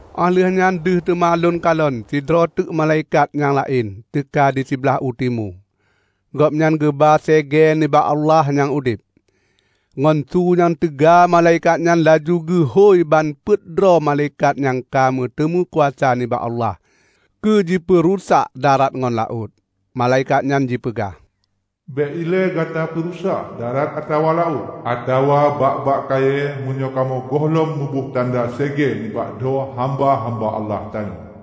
Óh lheueh nyan deuh teuma lôn kalon sidroe teuk malaikat nyang laén teuka di siblaih u timu. Gobnyan geuba segée nibak Allah nyang udeb. Ngon su nyang teuga malaikat nyan laju geuhôi ban peuet droe malaikat nyang ka meuteumé kuasa nibak Allah keujipeurusak darat ngon laôt. Malaikat nyan jipeugah, "Bék ilée gata peurusak darat atawa laôt, atawa bak-bak kayée meunyoe kamoe gohlom kamoe boh tanda segée nibak dho hamba-hamba Allah tanyoe."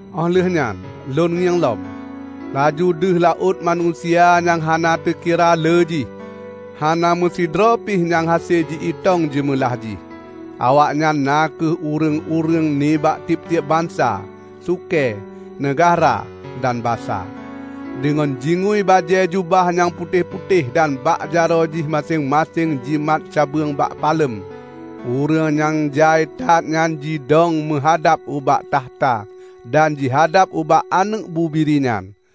Óh lheueh nyan lôn ngieng lom, laju deuh laôt manusia nyang hana teukira lé jih -- hana meusidroe pih nyang hase ji-itong jeumeulah jih. Awaknyan na kheueh ureuëng-ureuëng nibak tieb-tieb bansa, sukée, neugahra, dan basa. Deungon jingui bajée jubah nyang putéh-putéh dan bak jaroe jih maséng-maséng jimat cabeueng bak palem, ureuëng nyang jai that nyan jidong jimeuhadab ubak takhta dan jihadab ubak Aneuëk Bubiri nyan.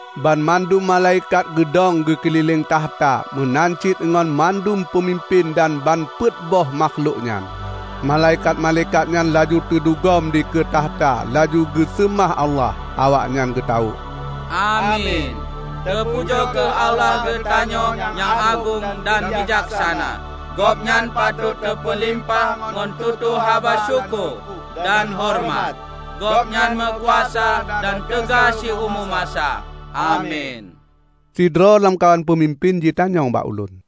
Banmandum malaikat geudong geukeulileng takhta meunan cit ngon mandum peumimpén dan ban peuet boh makhlok nyan. Malaikat-malaikat nyan laju teudugom dikeue takhta laju geuseumah Allah. Awaknyan geutawök, "Amin! Teupujoe kheueh Allah geutanyoe nyang agong dan bijaksana. Gobnyan patot teupeulimpah ngon tutoe haba syukoe dan horeumat. Gobnyan meukuasa dan teuga siumu masa! Amin." Sidroe lamkawan peumimpén jitanyong bak ulôn,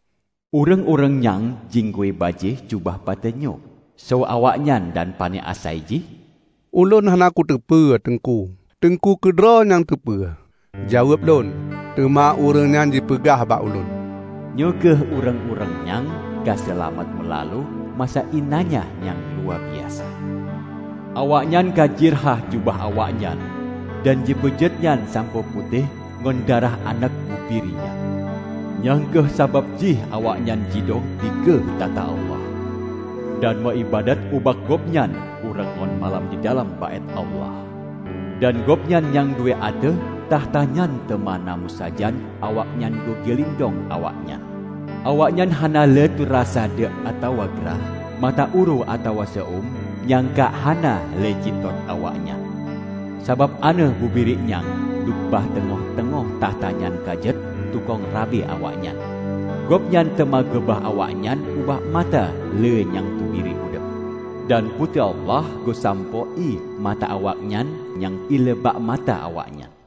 "Ureuëng-ureuëng nyang jingui bajée jubah putéh nyoe, soe awaknyan dan pane asai jih?" "Ulôn hana kuteupeue, Teungku. Teungku keudroe nyang teupeue," jaweueb lôn. Teuma ureuëng nyan jipeugah bak ulôn, "Nyoe kheueh ureuëng-ureuëng nyang ka seulamat meulalu masa iénanya nyang luwabiasa. Awaknyan ka jirhah jubah awaknyan dan jipeujeuet nyan sampoe putéh ngon darah Aneuëk Bubiri nyan. Nyang kheueh sabab jih awaknyan jidong dikeue takhta Allah, dan meu iébadat ubak Gobnyan uroe ngon malam didalam Baét Allah. Dan Gobnyan nyang duek ateueh takhta nyan teuma na meusajan awaknyan keugeulindong awaknyan. Awaknyan hana lé teurasa deuk atawa grah; mata uroe atawa seu-eum nyang kha hana lé jitot awaknyan, sabab Aneuëk Bubiri nyang duek bak teungoh-teungoh takhta nyan ka jeuet tukang rabe awaknyan. Gobnyan teuma geuba awaknyan ubak mata ié nyang teubri udeb. Dan Po teu Allah geusampôh ié mata awaknyan nyang ile bak mata awaknyan."